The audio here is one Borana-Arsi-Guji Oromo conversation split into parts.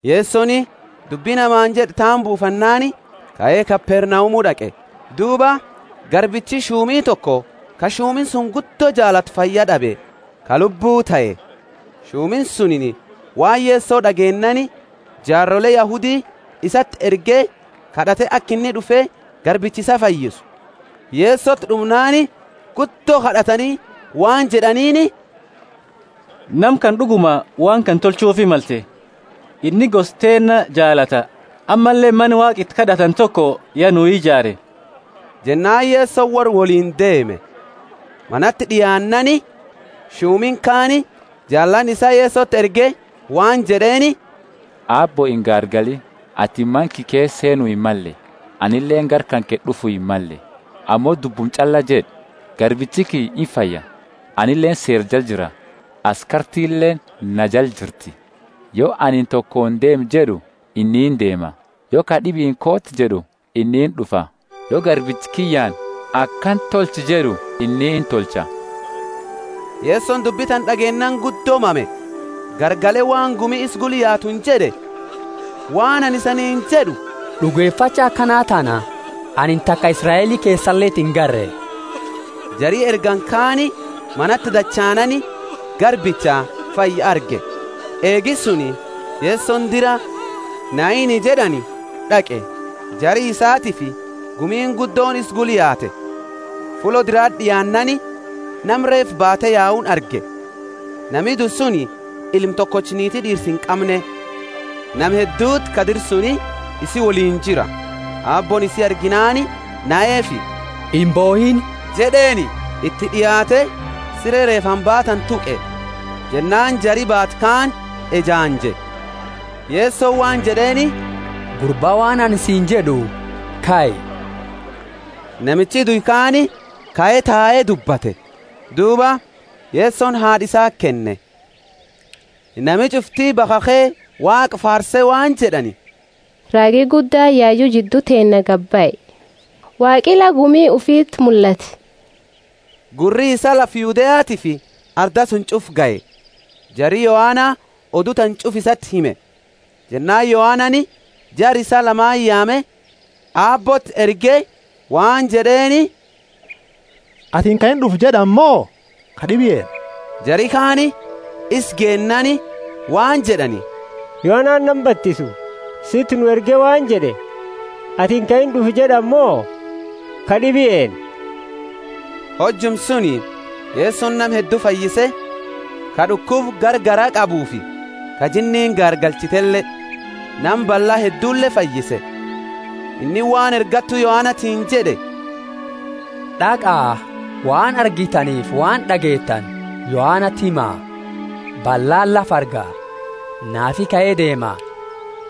Yesoni dubbi namaani jed'e tana buufannaani kae Kapernaumu d'aqe. Duuba garbichi shumi toko ka shumini suni guddo jaalatu fayyad'abe ka lubbuu tahe. Shumini suni waan Yeso d'ageennaani jaarole Yahudi isati erge kad'ate aka inni d'ufe garbicha isaa fayyisu. Yesoti d'umnaani guddo kad'atani waan jed'aniini, Nama kana d'uguma waan kana tolchuufi malte. Inni gosa teenna jaalata, ammalle mana Waaqa iti kad'atani toko ya nuu ijaare. Jennaani Yesoni worra woliini deeme. Manati d'iaannaani shumini kaani jaalaani isaa Yesoti erge waan jed'eeni, Aabbo, ingaargaliini. Atini mana kiyya keesa seenu himmalle: anileeni gara kanke d'ufu himmalle, ammo dubbuma ch'alla jed'i, garbichi kiyya imfaya. Anileeni seera jala jira, askartileeni na jala jirti. Yo anini tokooni, Deemi jed'u, inni indeema; yo kad'ibiini, Kooti jed'u, inni ind'ufa; yo garbicha kiyyaani, Akana tolchi jed'u, inni intolcha. Yesoni dubbi tana d'ageennaani guddo mame, garagale waan gumi isa gula yaatuuni jed'e, Waan anini isaniini jed'u, D'ugefacha akana tana anini taka Israeli keesaleti ingarre. Jari ergani kaani manati dachaanaani garbicha fayye arge. Eegi suni Yesoni dira Naini jed'ani d'aqe; jara isaatiifi gumiini guddooni isa gula yaate. Fullo dirati d'iaannaani, nama reefa baate yauni arge. Nami due suni ilma tokocha niiti d'iirsa inqamne, nama hedduti ka dira suni isi woliini jira. Aabbooni isi arginaani naheefi, Imbohiini jed'eeni. Iti d'iaate sire reefaani baatani tuqe, jennaani jari baatu kaani ejaanje. Yesoni waan jed'eeni gurba waan anini siini jed'u kai. Namichi due kaani kae tae dubbate. Duuba Yesoni haad'a isaati kenne. Nami ch'ufti bakhakhe Waaqa faarse waan jed'ani, Raagi guddaani yayu jiddu teennaa gadibahe: Waaqi la gumi ufiti mullate. Gurri isaa lafa Yudeatiifi arda suni ch'ufa gahe. Jari Yohana odu tana ch'ufa iti hime. Jennaani Yohanani jara isaa lama yaame Aabbooti erge waan jed'eeni, Atini ka ind'ufa jed'ani mo kad'ibi eenna? Jari kaani isa geennaani waan jed'ani, Yohanani nama batisu situ nu erge waan jed'e, Atini ka ind'ufa jed'ani mo kad'ibi eenna? Hojuma suni Yesoni nama heddu fayyise ka d'ukuba garagara qabuufi ka jinniini gaargalchitele, nama balla heddule fayyise. Inni waan ergattu Yohanatiini jed'e, D'aqa, waan argitaniifi waan d'ageetani Yohanati hima: ballaani lafa arga; naafi kae deema,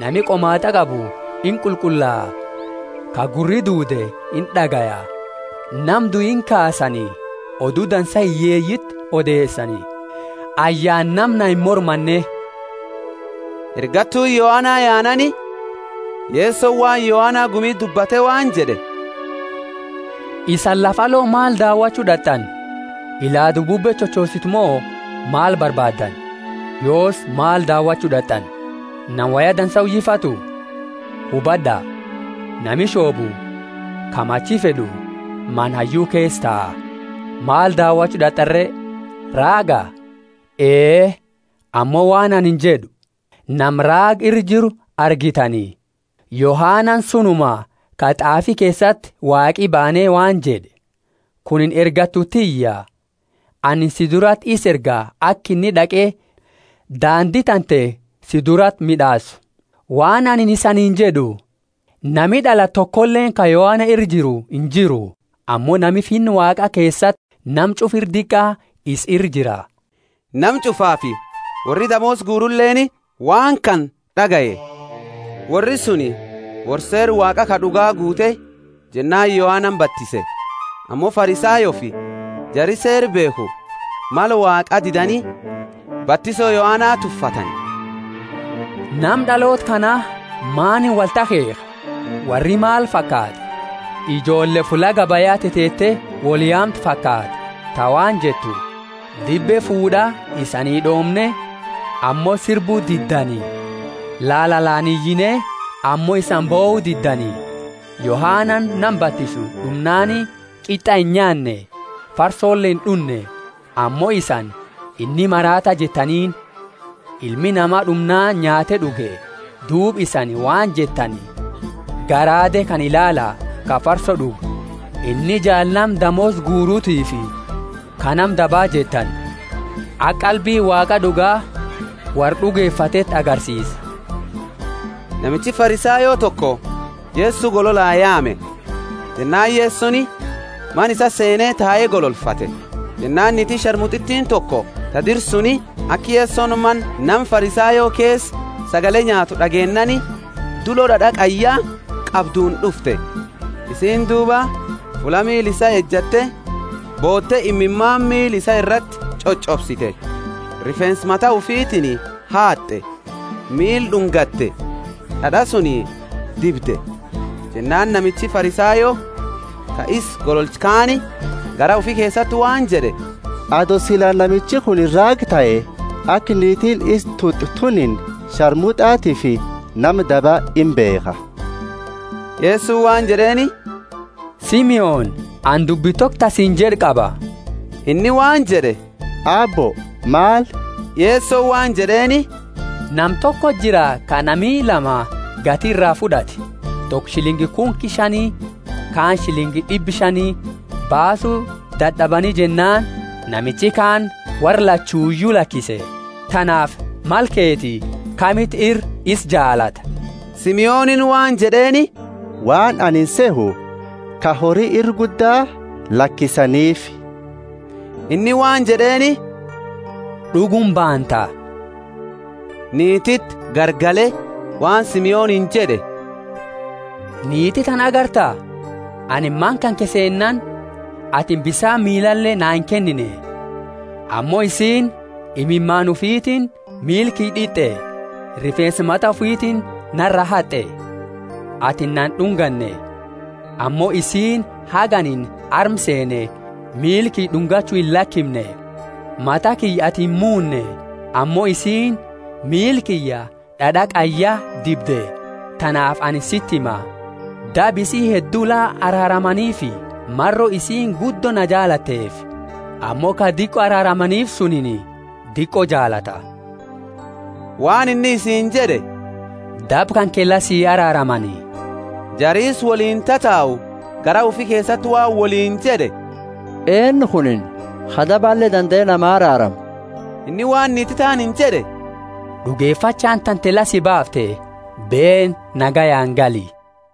nami qomaat'a qabu inqulqullaa, ka gurri duude ind'agaya; nama due inkaasani, Odu Dansa hiyyeeyiti odeesani. Ayyaana nama na imormanne. Ergattuuni Yohana yaannaani Yesoni waan Yohana gumiti dubbate waan jed'e, Isani lafa alo maal daawachu d'at'ani? Ilaadu bubbe chochositu mo maal barbaaddani? Yoosi maal daawachu d'at'ani? Nama woya dansa uyifatu? Hubad'a, nami shoobu, ka machi fed'u, mana hayyu keesa taa. Maal daawachu d'at'ani re? Raaga? Ee, ammo waan anini jed'u, Nama raaga ira jiru argitani. Yohanani sunuma ka t'aafi keesati Waaqi baane waan jed'e, Kunini ergattu tiyya; anini si durati isa erga aka inni d'aqe daandi tante si durati mid'aasu. Waan anini isaniini jed'u, Nama d'alate tokoleeni ka Yohana ira jiru injiru; ammo nami Finna Waaqa keesati nama ch'ufa ira diqa isa ira jira. Nama ch'ufaafi worri damoosa guruleeni waan kana d'agaye; worri suni worra Seera Waaqa ka d'uga guute jennaani Yohanani batise. Ammo Farisayoofi jari Seera beekhu mala Waaqaa didani batiso Yohana tuffatani. Nama d'aloota kana maaniini wolti akheekha? Worri maal fakaata? Ijoolle fulla gabaya teteete woli yaamtu fakaata, ta waan jettu, Dibbe fuud'aa isanii d'oomne ammo sirbu diddani! Lalalaani iyine ammo isani bohu diddani. Yohanani nama batisu d'umnaani qit'a inyaanne, farsole ind'unne, ammo isani, Inni maraata jettaniini. Ilmi Nama d'umnaani nyaate d'uge, duuba isaani waan jettani garaade kana ilaala ka farso d'ugu; inni jaala nama damoosa guuratifi ka nama daba jettani. Aka qalbiini Waaqa d'uga, worra d'ugefateeti agarsiisa. Namichi Farisayo toko Yeso gololaa yaame, jennaani Yesoni mana isaa seene tae gololfate. Jennaani niitiini sharmut'itiini toko ta dira suni, aka Yesoni mana nama Farisayo keesa sagale nyaatu d'ageennaani dulo d'ad'a qayya qabduuni d'ufte. Isiini duuba fulla miila isaa ejatte boote imimaani miila isaa irati ch'och'obsite, rifeensa mata ufitiini haat'e, miila d'ungate, d'ad'a suni dibde. Jennaani namichi Farisayo ka isa gololche kaani garaa ufi keesati waan jed'e, Ato sila namichi kunini raaga tahe, aka niitiini isa tut'u tunini sharmut'atiifi nama daba imbeekha. Yesoni waan jed'eeni, Simoni, anini dubbi toko ta siini jed'u qaba. Inni waan jed'e, Aabbo, maal? Yesoni waan jed'eeni, Nama tokoti jira ka nami lama gati ira fud'ate; toko shilingi kunki shani, kaani shilingi d'ibba shani. Baasu dad'abani jennaani namichi kaani worra lachuyu lakise. Tanaafi, mala keeti, kamiti ira isa jaalata? Simoniini waan jed'eeni, Waan anini sehu, ka hori ira gudda lakisaniifi. Inni waan jed'eeni, D'uguma baanta. Niititi garagale waan Simoniini jed'e, Niiti tana agarta? Anini mana kanke seennaani atini bisaani miilale naa inkennine, ammo isiini imimaani ufitiini miila kiyya d'it'e, rifeensa mata ufitiini nara haat'e. Atini na ind'unganne, ammo isiini haga anini arma seene miila kiyya d'ungachu illakimne. Mata kiyya atini imuune, ammo isiini miila kiyya d'ad'a qayyaa dibde. Tanaafi anini siti hima, Daba isii heddu la araaramaniifi maro isiini guddo na jaalatteefi. Ammo ka diqo araaramaniifi sunini diqo jaalata. Waan inni isiini jed'e, Daba kanke la si araaramani. Jari isa woliini tatau garaa ufi keesati waan woliini jed'e, Eennu kunini ka dabale dandae namaa araaramu? Inni waan niiti taaniini jed'e, D'ugefachaani tante la si baafte; beeni, nagayaani gali.